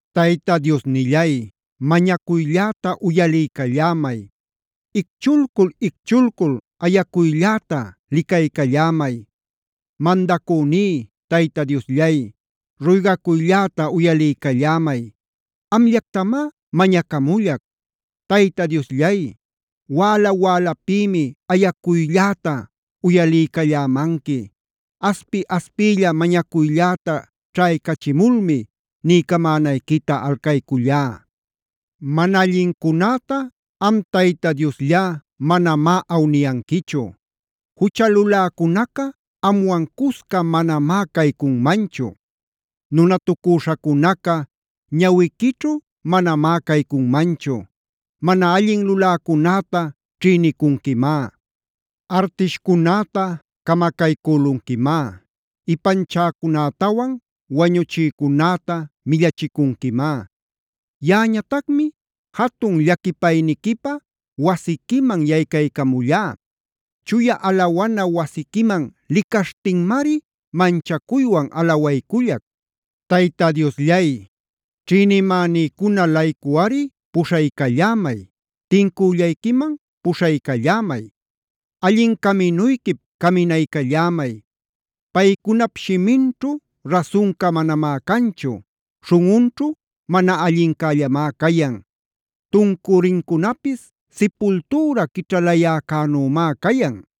Tayta Diosnillay, mañacuylläta uyaliycallämay. Icchulcul-icchulcul ayacuylläta licaycallämay. Mandacüní, Tayta Diosllay ruygacuylläta uyaliycallämay. Amllactamá mañacamullac. Tayta Diosllay, wäla-wälapïmi ayacuylläta uyaliycallämanqui. Aspi-aspiylla mañacuylläta ćhaycachimulmi niycamänayquita alcaycüllá. Mana allincunäta am Tayta Diosllá manamá awniyanquichu. Jucha luläcunaca amwan cusca manamá caycunmanchu. Nunatucüśhacunaca ñawiquićhu manamá caycunmanchu. Mana allin luläcunäta ćhïnicunquimá. Artishcunäta camacaycülunquimá. Ipanchäcunätawan wañuchicücunäta millachicunquimá. Yaꞌañatacmi jatun llaquipayniquipä wasiquiman yaycaycamullá. Chuya alawana wasiquiman licaśhtinmari manchacuywan alawaycullac. Tayta Diosllay, ćhïnimänïcuna-laycuꞌari puśhaycallämay, tincüllayquiman puśhaycallämay. Allin caminuyquip caminaycallämay. Paycunap shiminćhu rasunca manamá canchu. Śhunꞌunćhu mana allincällamá cayan. Tuncurincunapis sipultüra quićhalayäcänümá cayan.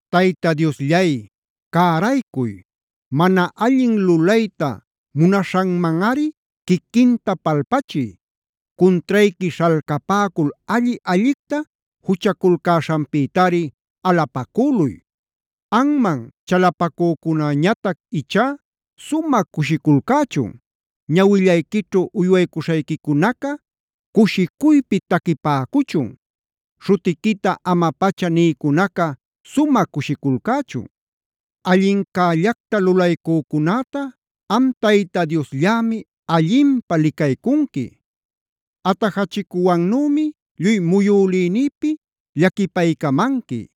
Tayta Diosllay, ¡cäraycuy! ¡Mana allin lulayta munaśhanmanꞌari quiquinta palpachiy! Cuntrayqui śhalcapäcul alli-allicta juchaculcäśhanpïtari alapacüluy. Anman chalapacücunäñatac ichá sumä cushiculcächun. Ñawillayquićhu uywaycuśhayquicunaca cushicuypi taquipäcuchun. Śhutiquita ama-pacha nïcunaca sumä cushiculcächun. Allincällacta lulaycücunäta am Tayta Diosllämi allinpä licaycunqui. Atajachicuwannümi lluy muyülïnïpi llaquipaycamanqui.